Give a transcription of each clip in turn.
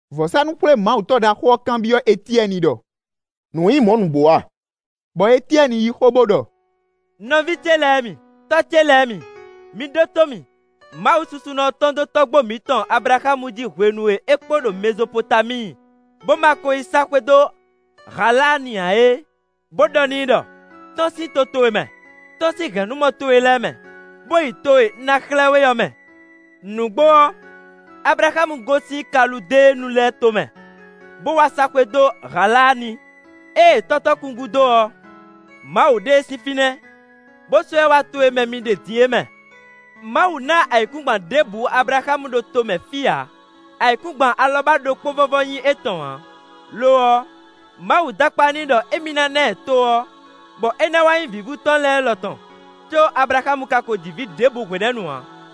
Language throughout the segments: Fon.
Vɔ̌sánú-xwlémawutɔ́ ɖaxó ɔ́ kanbyɔ́ Etyɛ́ni ɖɔ: “Nǔ nyí mɔ̌ nǔgbó a?” Bɔ Etyɛ́ni yí xó, bó ɖɔ: “Nɔví ce lɛ́ɛ mi, tɔ́ ce lɛ́ɛ mi, mi ɖótó mì. Mawu susunɔ ɔ́ tɔ́n dó tɔ́gbó mǐtɔn Ablaxámu jí hwenu e é kpo ɖo Mɛzopotamíi, bó ma kó yi sá xwé ɖó Haláani ǎ é, bó ɖɔ n'i ɖɔ: ‘Tɔ́n sín to towe mɛ; tɔ́n sín hɛ̌nnumɔ towe lɛ́ɛ mɛ, bó yi to e un ná xlɛ́ we ɔ́ mɛ.’ Nǔgbó ɔ́, Ablaxámu gosín Kaludéenu lɛ́ɛ tomɛ, bó wá sá xwé dó Haláani; ée tɔ́ tɔn kú gúdo ɔ́, Mawu ɖe e sín fínɛ́, bó sɔ́ ɛ wá to e mɛ mi ɖe din é mɛ. Mawu ná ayǐkúngban ɖěbǔ Ablaxámu ɖo tomɛ fí ǎ; ayǐkúngban alɔbá ɖokpó vɔ́vɔ́ nyí étɔn ǎ. Lo ɔ́, Mawu dó akpá n'i ɖɔ émí ná ná ɛ to ɔ́, bɔ é ná wá nyí vǐvú tɔn lɛ́ɛ lɔ tɔn, có Ablaxámu ka ko ji vǐ ɖěbǔ hwenɛ́nu ǎ.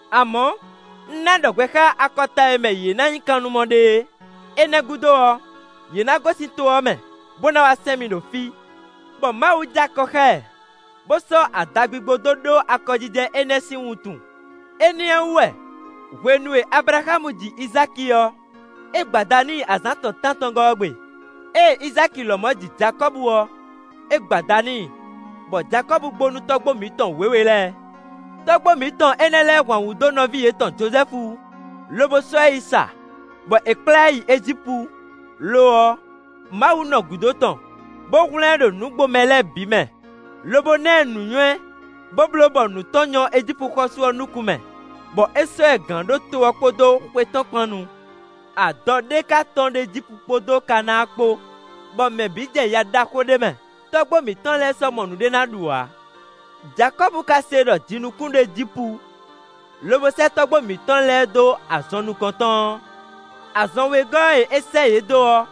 Amɔ̌, un ná ɖɔ hwɛ xá akɔta e mɛ yě ná nyí kannumɔ ɖe é. Énɛ́ gúdo ɔ́, yě ná gosín to ɔ́ mɛ, bó ná wá sɛn mì ɖo fí.’ Bɔ Mawu jɛ akɔ xá ɛ, bó sɔ́ adagbigbo dó ɖó akɔjijɛ énɛ́ sín wuntun. Énɛ́ ɔ́ wú wɛ hwenu e Ablaxámu ji Izáki ɔ́, é gbo ada n'i azǎn tɔn tántɔngɔ́ ɔ́ gbe. Ée Izáki lɔmɔ̌ ji Jakɔ́bu ɔ́, é gbo ada n'i, bɔ Jakɔ́bu gbo nú tɔ́gbó mǐtɔn wěwe lɛ́ɛ. “Tɔ́gbó mǐtɔn énɛ́ lɛ́ɛ hwan wǔ dó nɔví yětɔn Jozɛ́fu, lobo sɔ́ ɛ yi sa, bɔ è kplá ɛ yi Ejípu; lo ɔ́, Mawu nɔ gǔdo tɔn, bó hwlɛ́n ɛ ɖo nǔgbomɛ lɛ́ɛ bǐ mɛ, lobo ná ɛ nǔnywɛ́, bó bló bɔ nǔ tɔn nyɔ́ Ejípu xɔ́sú ɔ́ nukún mɛ, bɔ é sɔ́ ɛ gǎn ɖó to ɔ́ kpódó xwé tɔn kpán nu. Adɔ ɖé ka tɔ́n ɖo Ejípu kpódó Kanáa kpó, bɔ mɛ bǐ jɛ ya ɖaxó ɖé mɛ, tɔ́gbó mǐtɔn lɛ́ɛ sɔ́ mɔ nǔɖé ná ɖu ǎ. Jakɔ́bu ka se ɖɔ jinukún ɖo Ejípu, lobo sɛ́ tɔ́gbó mǐtɔn lɛ́ɛ dó azɔn nukɔn tɔn ɔ́. Azɔn wegɔ́ e é sɛ́ yě dó ɔ́,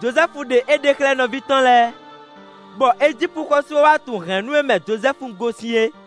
Jozɛ́fu ɖe éɖée xlɛ́ nɔví tɔn lɛ́ɛ, bɔ Ejípu xɔ́sú ɔ́ wá tunwun hɛ̌nnu e mɛ Jozɛ́fu gosín é.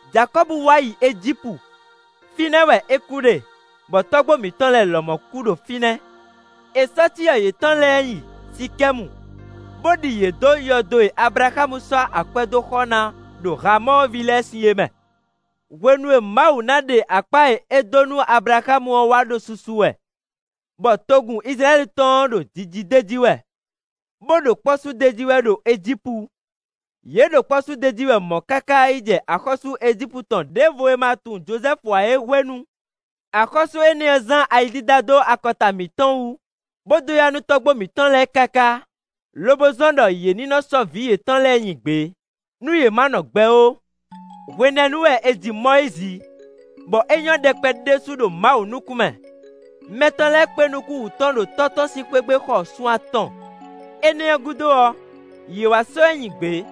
Jakɔ́bu wá yi Ejípu; fínɛ́ wɛ é kú ɖe, bɔ tɔ́gbó mǐtɔn lɛ́ɛ lɔmɔ̌ kú ɖo fínɛ́. È sɔ́ cyɔ yětɔn lɛ́ɛ yi Sikɛ́mu, bó ɖi yě dó yɔdo e Ablaxámu sɔ́ akwɛ́ dó xɔ ná ɖo Hamɔ́ɔ vǐ lɛ́ɛ sí é mɛ. “Hwenu e Mawu ná ɖe akpá e é dó nú Ablaxámu ɔ́ wá ɖo susu wɛ; bɔ togun Izlayɛ́li tɔn ɔ́ ɖo jiji d'é jí wɛ, bó ɖo kpɔ́ sú d'é jí wɛ ɖo Ejípu; yě ɖo kpɔ́ su d'é jí wɛ mɔ̌ káká yi jɛ axɔ́sú Ejípu tɔn ɖěvo e ma tunwun Jozɛ́fu ǎ é hwenu. Axɔ́sú énɛ́ ɔ́ zán ayi dídá dó akɔta mǐtɔn wú, bó dó ya nú tɔ́gbó mǐtɔn lɛ́ɛ káká, lobo zɔ́n ɖɔ yě ní nɔ́ sɔ́ vǐ yětɔn lɛ́ɛ nyi gbě, nú yě ma nɔ gbɛ ó. Hwenɛ́nu wɛ è ji Mɔyízi, bɔ é nyɔ́ ɖɛkpɛ ɖésú ɖo Mawu nukún mɛ. Mɛ tɔn lɛ́ɛ kpé nukún wú tɔn ɖo tɔ́ tɔn sín xwé gbe xɔ sun atɔn. Énɛ́ ɔ́ gúdo ɔ́, yě wá sɔ́ ɛ nyi gbě,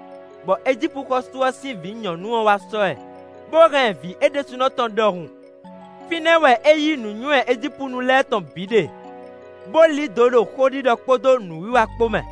bɔ Ejípu xɔ́sú ɔ́ sín vǐ nyɔ̌nu ɔ́ wá sɔ́ ɛ, bó hɛn ɛ vǐ é ɖésúnɔ tɔn ɖɔhun. Fínɛ́ wɛ é yí nǔnywɛ́ Ejípunu lɛ́ɛ tɔn bǐ ɖe, bó lí dǒ ɖo xóɖiɖɔ kpódó nǔwiwa kpó mɛ.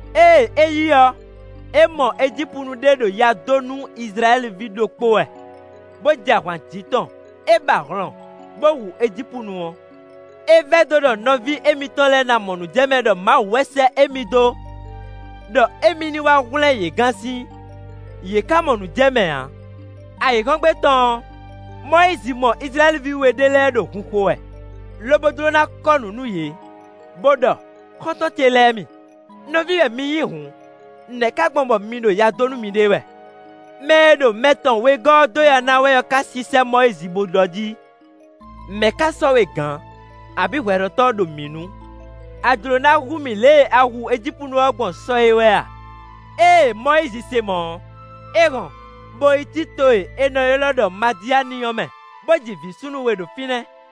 Ée é yi ɔ́, é mɔ Ejípunu ɖé ɖo ya dó nú Izlayɛ́li ví ɖokpó wɛ, bó jɛ ahwan jǐ tɔn; é ba hlɔn, bó hu Ejípunu ɔ́. É vɛdó ɖɔ nɔví émítɔn lɛ́ɛ ná mɔ nǔ jɛ mɛ ɖɔ Mawu wɛ sɛ́ émí dó ɖɔ émí ní wá hwlɛ́n yě gán sín; yě ká mɔ nǔ jɛ mɛ ǎ. Ayǐhɔ́ngbe tɔn ɔ́, Mɔyízi mɔ Izlayɛ́li ví we ɖé lɛ́ɛ ɖo hun xo wɛ, lobo jló ná kɔ́ nǔ nú yě, bó ɖɔ: ‘Xɔ́ntɔn ce lɛ́ɛ mi; nɔví wɛ mi nyí hǔn. Nɛ̌ ká gbɔn bɔ mi ɖo ya dó nú miɖée wɛ?’ Mɛ e ɖo mɛ tɔn wegɔ́ ɔ́ dó ya ná wɛ ɔ́ ká sísɛ́ Mɔyízi bó ɖɔ jí: ‘Mɛ̌ ká sɔ́ we gǎn, abǐ hwɛɖɔtɔ́ ɖo mǐ nu? A jlǒ ná hu mì lě e a hu Ejípunu ɔ́ gbɔn sɔ é wɛ a?’ Ée Mɔyízi se mɔ̌ ɔ́, é hɔn bó yi cí to e è nɔ ylɔ́ ɖɔ Madiáani ɔ́ mɛ, bó ji vǐ súnnu we ɖo fínɛ́.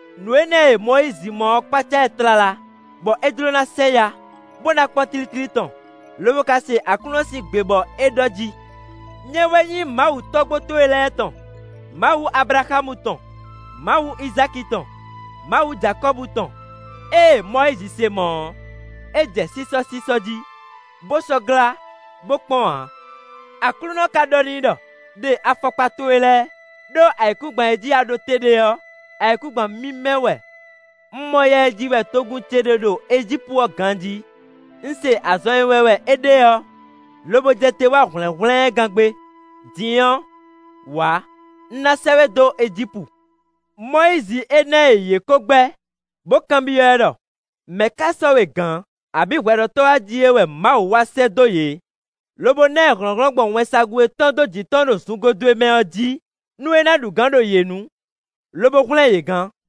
Nǔ énɛ́ e Mɔyízi mɔ ɔ́ kpácá ɛ tlala, bɔ é jló ná sɛ yá, bó ná kpɔ́n tlítlí tɔn, lobo ká se Aklúnɔ sín gbe bɔ é ɖɔ jí: ‘Nyɛ wɛ nyí Mawu tɔ́gbó towe lɛ́ɛ tɔn; Mawu Ablaxámu tɔn; Mawu Izáki tɔn; Mawu Jakɔ́bu tɔn.’ Ée Mɔyízi se mɔ̌ ɔ́, é jɛ sísɔ́sísɔ́ jí, bó sɔ́ glá, bó kpɔ́n ǎ. Aklúnɔ ka ɖɔ n'i ɖɔ: ‘ɖe afɔkpa towe lɛ́ɛ, ɖó ayǐkúngban e jí a ɖo te ɖe ɔ́, ayǐkúngban mímɛ́ wɛ. Un mɔ ya e ji wɛ togun ce ɖe ɖo Ejípu ɔ́ ganjí. Un se azɔn e wɛn wɛ é ɖe ɔ́, lobo jɛ te wá hwlɛ̌nhwlɛ́n ɛ gán gbé. Din ɔ́, wǎ. Un ná sɛ́ we dó Ejípu.’ “Mɔyízi énɛ́ e yě kó gbɛ́, bó kanbyɔ́ ɛ ɖɔ: ‘Mɛ̌ ká sɔ́ we gǎn, abǐ hwɛɖɔtɔ́’ a jí é wɛ Mawu wá sɛ́ dó yě, lobo ná ɛ hlɔ̌nhlɔ́n gbɔn wɛnsagun e tɔ́n dó jǐ tɔn ɖo zungodwe mɛ ɔ́ jí, nú é ná ɖu gǎn ɖo yě nu, lobo hwlɛ́n yě gán.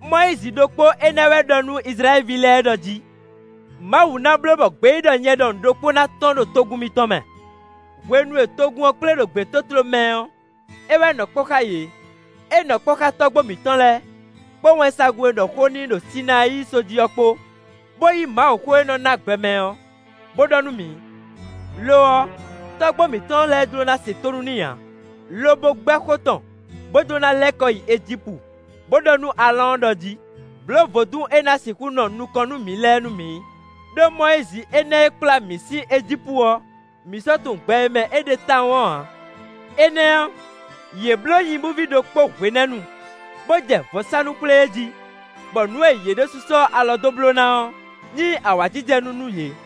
Mɔyízi ɖokpó énɛ́ wɛ ɖɔ nú Izlayɛ́li ví lɛ́ɛ ɖɔ jí: ‘Mawu ná bló bɔ gbeyíɖɔ nyɛ ɖɔhun ɖokpó ná tɔ́n ɖo togun mitɔn mɛ.’ Hwenu e togun ɔ́ kplé ɖo gbětótló mɛ ɔ́, é wɛ nɔ kpɔ́ xá yě; é nɔ kpɔ́ xá tɔ́gbó mǐtɔn lɛ́ɛ, kpó wɛnsagun e ɖɔ xó n'i ɖo Sinayíi só jí ɔ́ kpó, bó yí Mawuxó e nɔ́ ná gbɛ mɛ ɔ́, bó ɖɔ nú mǐ. “Lo ɔ́, tɔ́gbó mǐtɔn lɛ́ɛ jló ná se tónú n'i ǎ, lobo gbɛ́ xó tɔn, bó jló ná lɛ́ kɔ yi Ejípu, bó ɖɔ nú Aalɔ́ɔn ɖɔ jí: ‘Blǒ vodún e ná sixú nɔ nukɔn nú mǐ lɛ́ɛ nú mǐ; ɖó Mɔyízi énɛ́ e kplá mǐ sín Ejípu ɔ́, mǐ sɔ́ tunwun gbɛ e mɛ é ɖe tawun ɔ́ ǎ.’ Énɛ́ ɔ́, yě bló nyibúví ɖokpó hwenɛ́nu, bó jɛ vɔ̌sánú xwlé e jí, bɔ nǔ e yě ɖésú sɔ́ alɔ dó bló ná ɔ́, nyí awǎjijɛnú nú yě.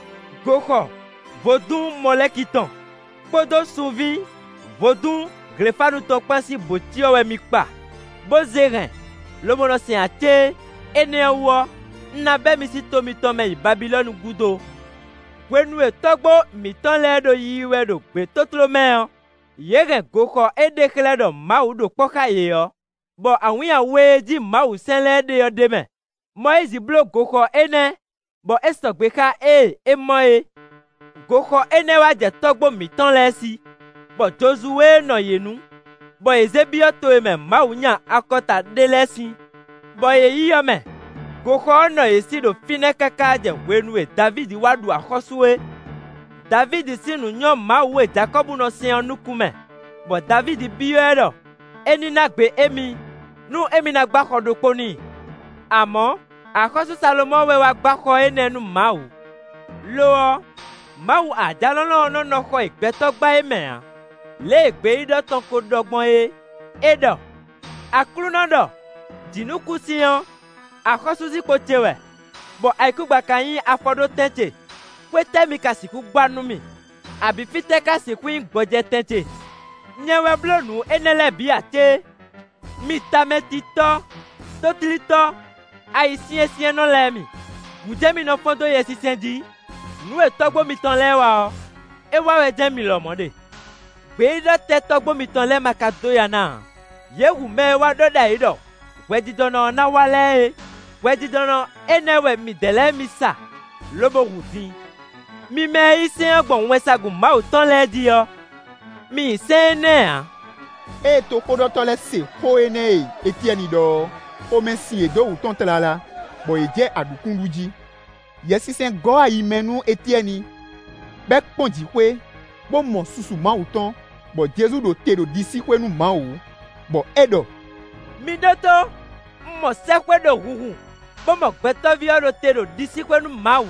Goxɔ vodún Mɔlɛ́ki tɔn, kpódó sunví vodún Hlefánu tɔn kpán sín bǒcyɔ wɛ mi kpa, bó zé hɛn, lobo nɔ sɛn ǎ cé? Énɛ́ ɔ́ wú ɔ́, un ná bɛ́ mi sín to mitɔn mɛ yi Babilɔ́nu gúdo.’ “Hwenu e tɔ́gbó mǐtɔn lɛ́ɛ ɖo yiyi wɛ ɖo gbětótló mɛ ɔ́, yě hɛn goxɔ e ɖe xlɛ́ ɖɔ Mawu ɖo kpɔ́ xá yě ɔ́, bɔ awǐnnya we e jí Mawusɛ́n lɛ́ɛ ɖe ɔ́ ɖ'é mɛ. Mɔyízi bló goxɔ énɛ́, bɔ é sɔgbe xá ée é mɔ é. Goxɔ énɛ́ wá jɛ tɔ́gbó mǐtɔn lɛ́ɛ sí; bɔ Jozuwée nɔ yě nu, bɔ yě zé byɔ́ to e mɛ Mawu nya akɔta ɖé lɛ́ɛ sín, bɔ yě yi ɔ́ mɛ. Goxɔ ɔ́ nɔ yě sí ɖo fínɛ́ káká jɛ hwenu e Davídi wá ɖu axɔ́sú é. Davídi sín nǔ nyɔ́ Mawu e Jakɔ́bu nɔ sɛn ɔ́ nukún mɛ, bɔ Davídi byɔ́ ɛ ɖɔ é ní ná gbe émí, nú émí ná gbá xɔ ɖokpó n'i. Amɔ̌, axɔ́sú Salomɔ́ɔ wɛ wá gbá xɔ énɛ́ nú Mawu. “Lo ɔ́, Mawu Ajalɔ̌nlɔn ɔ́ nɔ́ nɔ xɔ e gbɛtɔ́ gbá é mɛ ǎ, lě e gbeyíɖɔ tɔn ko ɖɔ gbɔn é; é ɖɔ: Aklúnɔ ɖɔ: ‘Jǐnukúnsin ɔ́, axɔ́súzinkpo ce wɛ, bɔ ayǐkúngban ka nyí afɔɖótɛn ce. Xwé tɛ́ mi ka sixú gbá nú mì? Abǐ fítɛ́ ka sixú nyí gbɔjɛtɛn ce? Nyɛ wɛ bló nǔ énɛ́ lɛ́ɛ bǐ ǎ cé?’ “Mi tamɛtitɔ́, tótlítɔ́, ayisyɛ́nsyɛ́nnɔ lɛ́ɛ mi; gǔ jɛ́n mi nɔ fɔ́n dó Yɛsinsɛn jí; nǔ e tɔ́gbó mitɔn lɛ́ɛ wa ɔ́, é wa wɛ jɛ́n mi lɔmɔ̌ ɖe. Gbeyíɖɔ tɛ́ tɔ́gbó mitɔn lɛ́ɛ má ka dó ya ná ǎ? Yě hu mɛ e wá ɖɔ ɖ'ayǐ ɖɔ hwɛjijɔnɔ ɔ́ ná wá lɛ́ɛ é. Hwɛjijɔnɔ énɛ́ wɛ midɛɛ lɛ́ɛ mi sa, lobo hu din. Mi mɛ e yí sɛ́n ɔ́ gbɔn wɛnsagun Mawu tɔn lɛ́ɛ jí ɔ́, mi nyi sɛ́n énɛ́ ǎ.” Ée toxóɖɔtɔ́ lɛ́ɛ se xó énɛ́ e Etyɛ́ni ɖɔ ɔ́, xomɛ sin yě dó wǔ tɔn tlala, bɔ yě jɛ aɖǔkún ɖu jí. Yɛsinsɛn gɔ́ ayi mɛ nú Etyɛ́ni, bɔ é kpɔ́n jǐxwé, bó mɔ susu Mawu tɔn, bɔ Jezu ɖo te ɖo ɖisíxwé nú Mawu, bɔ é ɖɔ: “Mi ɖótó! Un mɔ sɛ́xwé ɖo hunhun, bó mɔ Gbɛtɔ́ví ɔ́ ɖo te ɖo ɖisíxwé nú Mawu.”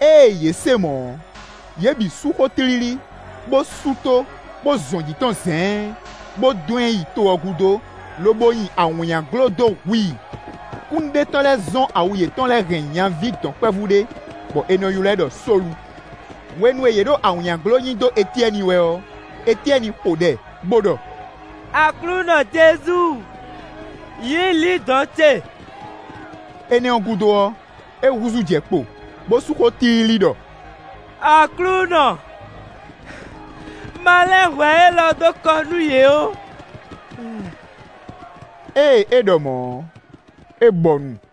Ée yě se mɔ̌ ɔ́, yě bǐ sú xó tlílí, bó sú tó, bó zɔn jǐ tɔn zɛ̌ɛ́n, bó dɔn ɛ yi to ɔ́ gúdo, lobo nyi awǐnnyaglo dó hu i. Kúnnuɖetɔ́ lɛ́ɛ zɔ́n awu yětɔn hɛn nyaví dɔ̌nkpɛvú ɖé, bɔ è nɔ ylɔ́ ɛ ɖɔ Sólu. Hwenu e yě ɖo awǐnnyaglo nyi dó Etyɛ́ni wɛ ɔ́, Etyɛ́ni xo ɖɛ, bó ɖɔ: “Aklúnɔ Jezu, yǐ lǐndɔ̌n ce.” Énɛ́ ɔ́ gúdo ɔ́, é húzú jɛ kpo, bó sú xó tlílí ɖɔ: “Aklúnɔ, ma lɛ́n hwɛ élɔ́ dó kɔ nú yě ó.” Ée é ɖɔ mɔ̌ ɔ́, é bɔnu.